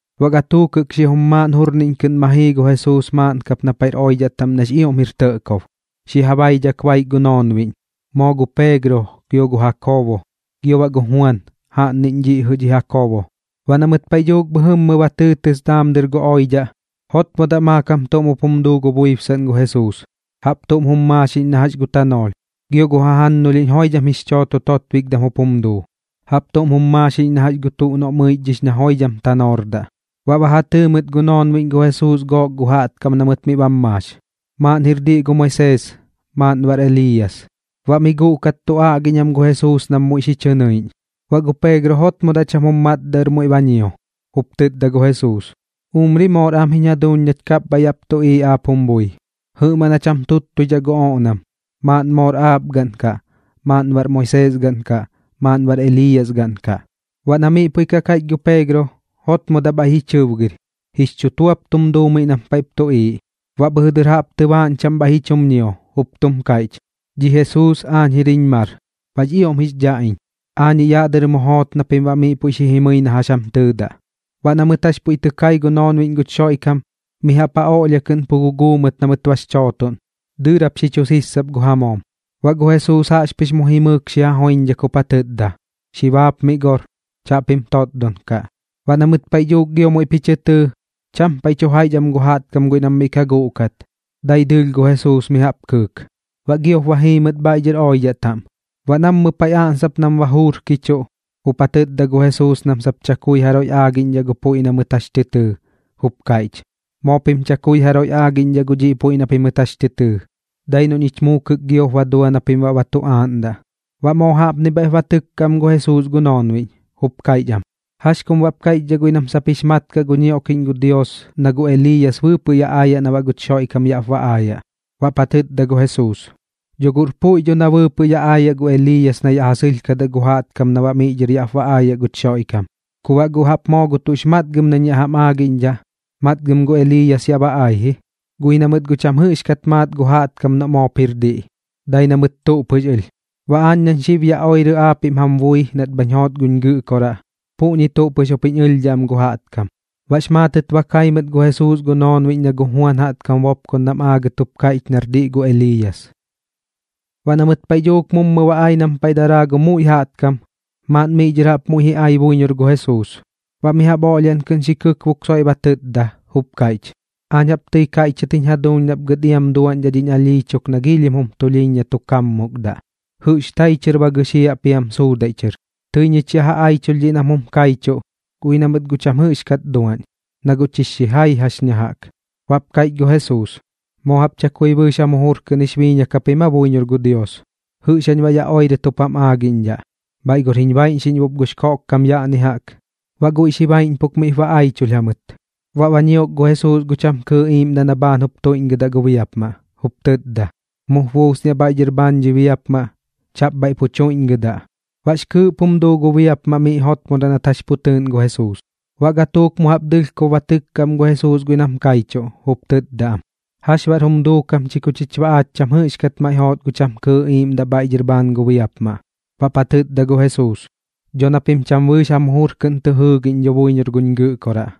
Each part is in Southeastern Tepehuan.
Baꞌ gatuuk jɨꞌk xijum maaꞌn jurniꞌñ kɨꞌn ma jii gu Jesuus maaꞌn kap na paiꞌr oidhaꞌ taꞌm nax ioꞌm jir tɇꞌkob, xi ja baidhak baik gu noonbiꞌñ, moo gu Peegro, gio gu Jakoobo, gio baꞌ gu Juan jaꞌnniꞌñ dhiꞌ jɨꞌ dhi Jakoobo. Baꞌ na mɨt paiꞌ dhuuk bhɨjɨmmɨ ba tɨɨtɨs daam dɨr gu oidhaꞌ, jotmodaꞌ maakam tuꞌm jup jum duu gu buibsaꞌn gu Jesuus, jaꞌp tuꞌm jum maaxiꞌñ na jax gu tanoolh, gio gu jajannulhiꞌñ joidham jix chooto totbikdam jup jum duu, jaꞌp tuꞌm jum maaxiꞌñ na jax gu tuꞌ noꞌ mɨichdhix na joidham tanoordaꞌ. Baꞌ ba ja tɨɨ mɨt gu noonbiꞌñ gu Jesuus gook gu jaꞌtkam na mɨt miꞌ bam maax, maaꞌn jir diꞌ gu Moisees, maaꞌn baꞌr Eliiyas. Baꞌ miꞌ guꞌkat tu aꞌgiꞌñ am gu Jesuus nam muiꞌ xi chɨ nɨiꞌñ. Baꞌ gu Peegro jotmodaꞌ cham jum matdaꞌ ɨr muiꞌ ba ñio, jup tɨtda gu Jesuus: ―Umri moor am jiñ jaduuñ nach kapbhaiꞌ yaꞌp tuꞌiiꞌ aap jum bui. Jɨꞌmaꞌn jach jam tuttuidhaꞌ gu oꞌnam, maaꞌn moor aap gaꞌn kaꞌ, maaꞌn baꞌr Moisees gaꞌn kaꞌ, maaꞌn baꞌr Eliiyas gaꞌn kaꞌ. Baꞌ na miꞌ puiꞌ ka kaiꞌch gu Peegro, jotmodaꞌ bhaiꞌ ji chɨbgɨr, jix chutuap tum duu miꞌ nam paiꞌp tuꞌiiꞌ. Baꞌ bhɨjɨ dɨr jaꞌp tɨbaaꞌñ chaꞌm bhaiꞌ ji chum ñio, jup tum kaiꞌch: ―Dhi Jesuus aañ jir jiñ mar, baꞌx ioꞌm jix dhaꞌ iñ. Aañiꞌ yaꞌ dɨr mu joot na pim baꞌ miꞌ puiꞌ xi jimɨi na jax jam tɨɨdaꞌ. Baꞌ na mɨt jax puiꞌ tɨ kai gu noonbiꞌñ guch Xoiꞌkam, mi jaꞌp ja oꞌlhia kɨꞌn pu guguu mɨt na mɨt bax chootoꞌn, dɨɨrap xi chu siisap gu ja moom. Baꞌ gu Jesuus jaꞌxpɨx mu jimɨɨk miꞌ xi ja joiñdhak jup ja tɨtda: ―Xi baapmiꞌ gor. Chaꞌpim totdon kaꞌ. Baꞌ na mɨt paiꞌ dhuuk gio muiꞌp ji chɨ tɨɨ, cham paiꞌ tu jaiꞌch am gu jaꞌtkam guiꞌ nam miꞌ ka guꞌkat, dai dɨɨlh gu Jesuus mi jaꞌp kɨɨk. Baꞌ giop ba jii mɨt bhaiꞌ dhɨr oidhaꞌ taꞌm. Baꞌ nammɨ paiꞌ aꞌnsap nam ba juurkichuꞌ, jup ja tɨtda gu Jesuus nam sap chakui jaroiꞌ aagiꞌñdhaꞌ gu puiꞌ na mɨt jax tɨ tɨɨ, jup kaiꞌch: ―Moo pim chakui jaroiꞌ aagiꞌñdhaꞌ gu dhiꞌ puiꞌ na pimɨt jax tɨ tɨɨ. Dai noꞌ ñich muukɨk giop ba dua na pim baꞌ ba tu aaꞌndaꞌ. Baꞌ moo jaꞌpni bhaiꞌp ba tɨkka am gu Jesuus gu noonbiꞌñ, jup kaiꞌch am: ―¿Jax kum baꞌp kaiꞌchdhaꞌ guiꞌ nam sap jix mat kaꞌ gu ñioꞌkiꞌñ gu Dios na gu Eliiyas bɨɨpɨꞌ yaꞌ aayaꞌ na baꞌ guch Xoiꞌkam yaꞌp ba aayaꞌ? Baꞌp ja tɨtda gu Jesuus: ―Dho guꞌr puiꞌ dho na bɨɨpɨꞌ yaꞌ aayaꞌ gu Eliiyas na yaꞌ ja sɨlhkadaꞌ gu jaꞌtkam na baꞌ miꞌ dhɨr yaꞌp ba aayaꞌ guch Xoiꞌkam. Ku baꞌ guꞌ jaꞌp moo gu tuꞌx matgɨm nañ yaꞌ jam aagiꞌñdhaꞌ, matgɨm gu Eliiyas yaꞌ ba ai ji, guꞌ ji na mɨt guꞌ cham jɨꞌxkat maat gu jaꞌtkam noꞌ moop jir diꞌ, dai na mɨt tuꞌ pɨx ɨlh. Baꞌ aañ nañ xib yaꞌ oirɨ aapiꞌm jam bui nat bhañ joot guñ Gɨꞌkoraꞌ, puꞌñi tuꞌ pɨx jup jiñ ɨlhdhaꞌ am gu jaꞌtkam. Bax maatɨt ba kai mɨt gu Jesuus gu noonbiꞌñ na gu Juan jaꞌtkam bopkondam aagɨt jup kaiꞌch nar diꞌ gu Eliiyas. Baꞌ na mɨt paiꞌ dhuuk mummɨ ba ai nam paiꞌ daraa gu muiꞌ jaꞌtkam, maaꞌn miꞌ dhɨr jaꞌp muiꞌ ji ai buiñor gu Jesuus, baꞌ mi jaꞌp oꞌlhiaꞌn kɨꞌn xi kɨkbok soiꞌ ba tɨtda, jup kaiꞌch: ―Aañ jaꞌp tɨi kaiꞌchidhat jiñ jaduuñ nap gɨt iam duaꞌñdhaꞌ dhiñ alhii chuk na giilhim jum tulhiiñ na tu kaammukdaꞌ. Jɨꞌx tai chɨr ba gɨxiaꞌ piam suudaiꞌ chɨr. Tɨi ñich ya ja aichulh dhiꞌ nam jum kaichuꞌ, guꞌ ji na mɨt guꞌ cham jɨꞌxkat duaꞌñ, na guꞌ chix xijai jax ña jaꞌk. Baꞌp kaiꞌch gu Jesuus: ―¿Moo jaꞌp chakui bɨɨx jam jujur kɨꞌn jix biiñak japim aa buiñor gu Dios? ¿Jɨꞌx jañ baꞌ yaꞌ pu oirɨt jup jam aagiꞌñdhaꞌ? Bhaiꞌ gor jiñ baiꞌñxiꞌñbop gux koꞌkkam yaꞌni jaꞌk. Baꞌ guiꞌ xi baiꞌñpuk miꞌp ba aichulh jamɨt. Baꞌ ba ñiok gu Jesuus gu cham kɨɨꞌ iiꞌmdaꞌ na bhaan jup tuiꞌdhiꞌ gu biapmaꞌ, jup tɨtda: ―Mup buusniaꞌ bhaiꞌ dhɨr bhaan dhi biapmaꞌ. Chaꞌp bhaiꞌ pu tuiꞌñgɨdaꞌ. Baꞌx kɨɨꞌp jum duu gu biapmaꞌ miꞌ jotmodaꞌ nat jax pu tɨɨꞌn gu Jesuus. Baꞌ gatuuk mu jaꞌp dɨlhkob ba tɨkka am gu Jesuus guiꞌ nam kaichuꞌ, jup tɨtda am: ―¿Jax baꞌr jum duukam chi ku chich baꞌ aach cham jɨꞌxkat maiꞌ joot gu cham kɨɨꞌ iiꞌmdaꞌ bhaiꞌ dhɨr bhaan gu biapmaꞌ? Baꞌp ja tɨtda gu Jesuus: ―Dho na pim cham bɨɨx jam jujur kɨꞌn tɨ jɨɨgiꞌñ dho buiñor guñ Gɨꞌkoraꞌ.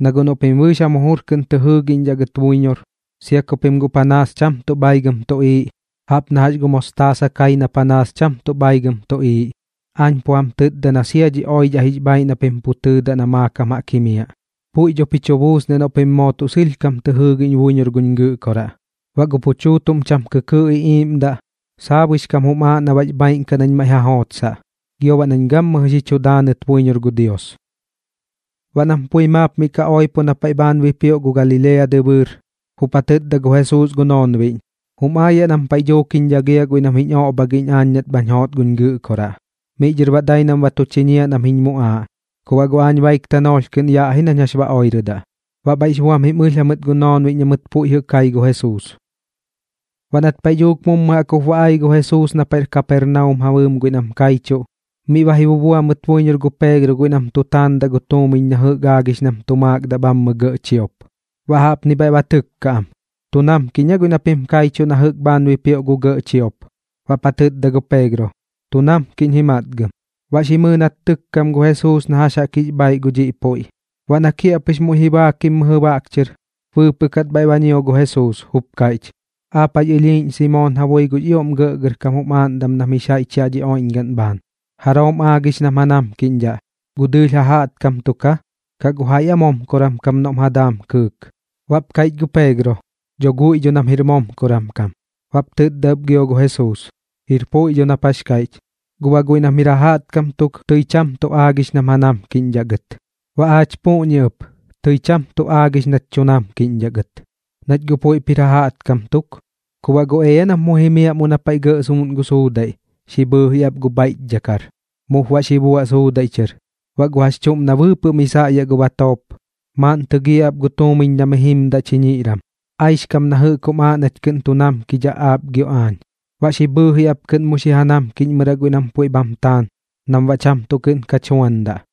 Na guꞌ noꞌ pim bɨɨx jam jujur kɨꞌn tɨ jɨɨgiꞌñdhaꞌ gɨt buiñor, sia ku pim guꞌ panaas cham tuꞌ bhaigɨm tuꞌiiꞌ, jaꞌp na jax gu mostaasa kai na panaas cham tuꞌ bhaigɨm tuꞌiiꞌ, aañ pu jam tɨtda na sia dhi oidhaꞌ jix bhaaiꞌ na pim pu tɨɨdaꞌ na maakam jaꞌk jimiaꞌ, puiꞌ dho ji chu buusniaꞌ noꞌ pim moo tuꞌ sɨlhkam tɨ jɨɨgiꞌñ buiñor guñ Gɨꞌkoraꞌ. Baꞌ gu pu chuutuꞌm cham kɨkɨɨꞌ iꞌiiꞌmdaꞌ, saabuix kam jum aaꞌ na baꞌx bhaaiꞌn kaꞌ nañ maiꞌ ja jootosdaꞌ, gio baꞌ nañ gammɨjɨ xi tu daanɨt buiñor gu Dios. Baꞌ nam pui maap miꞌ ka oipo na paiꞌ bhaan bipioꞌ gu Galilea dɨbɨɨr, jup ja tɨtda gu Jesuus gu noonbiꞌñ: ―Jum aayaꞌ nam paiꞌ dhuuk jiñ dhagiaꞌ guiꞌ nam jiñ oꞌbhagiꞌñ aañ nat bhañ joot guñ Gɨꞌkoraꞌ. Miꞌ dhɨr baꞌ dai nam ba tu chiñiaꞌ nam jiñ muꞌaaꞌ, ku baꞌ guꞌ aañ baik tanoolh kɨꞌn yaꞌ ji nañ jax ba oirɨdaꞌ. Baꞌ bhaiꞌx buam jim ɨlh jamɨt gu noonbiꞌñ na mɨt puiꞌ jɨꞌ kai gu Jesuus. Baꞌ nat paiꞌ dhuuk mummɨ jaꞌk jup ba ai gu Jesuus na paiꞌr Kapernaum ja bɨɨm guiꞌ nam kaichuꞌ, miꞌ ba ji bubua mɨt buiñor gu Peegro guiꞌ nam tu taandaꞌ gu tuumiñ na jɨꞌk aagix nam tu maakdaꞌ bhammɨ gɇꞌ chiop. Baꞌ jaꞌpni bhaiꞌ ba tɨkka am: ―¿Tu namkiꞌñ aa guiꞌ na pim kaichuꞌ na jɨꞌk bhaan bipioꞌ gu gɇꞌ chiop? Baꞌp ja tɨtda gu Peegro: ―Tu namkiꞌñ ji matgɨm. Baꞌ xi mɨɨ nat tɨkkam gu Jesuus na jax jaꞌk jix bhaiꞌ gu dhiꞌ puiꞌ. Baꞌ na kiaꞌpɨx muiꞌ ji baakim mɨjɨ baꞌk chɨr, bɨɨpɨꞌ kat bhaiꞌ ba ñio gu Jesuus, jup kaiꞌch: ―¿Aap jax ɨlhiiꞌñ Simoon ja bui gux ioꞌm gɇꞌgɇrkam jum aaꞌndam nam jix jaiꞌch yaꞌ dhi oiꞌñgaꞌn bhaan? ¿Jaroom aagix nam ja namkiꞌñdhaꞌ, gu dɨɨlh ja jaꞌtkam tuk aa, kaꞌ gu jaiꞌ aa momkoran kam noꞌm ja daam kɨɨk? Baꞌp kaiꞌch gu Peegro: ―Dho guiꞌ dho nam jir momkoran kam. Baꞌp tɨtda ɨp gio gu Jesuus: ―Jir puiꞌ dho nap jax kaiꞌch, guꞌ baꞌ guiꞌ nam jir ja jaꞌtkam tuk tɨi cham tuꞌ aagix nam ja namkiꞌñdhaꞌ gɨt. Baꞌ aach puꞌñi ɨp, tɨi cham tuꞌ aagix nach tu namkiꞌñdhaꞌ gɨt, nach guꞌ puiꞌp jir ja jaꞌtkam tuk. Ku baꞌ guꞌ ea nap mu jimiaꞌ mummɨ na paiꞌ gɇꞌ suuꞌn gu suudaiꞌ xi bhɨɨji ap gu bhaiꞌchdhakar, mup baꞌ xi buaꞌ suudaiꞌ chɨr. Baꞌ gu jax chuꞌm na bɨɨpɨꞌ miꞌ saꞌyaꞌ gu batoop, maaꞌn tɨgiaꞌ ap gu tuumiñ na mi jimdaꞌ chiñiꞌran, aixkam na jɨꞌk jum aaꞌ nach kɨꞌn tu namkidhaꞌ aap gio aañ. Baꞌ xi bhɨɨji ap kɨꞌn mu xi ja namkiꞌñmɨraꞌ guiꞌ nam puiꞌ bham taan nam baꞌ cham tuꞌ kɨꞌn kach juandaꞌ.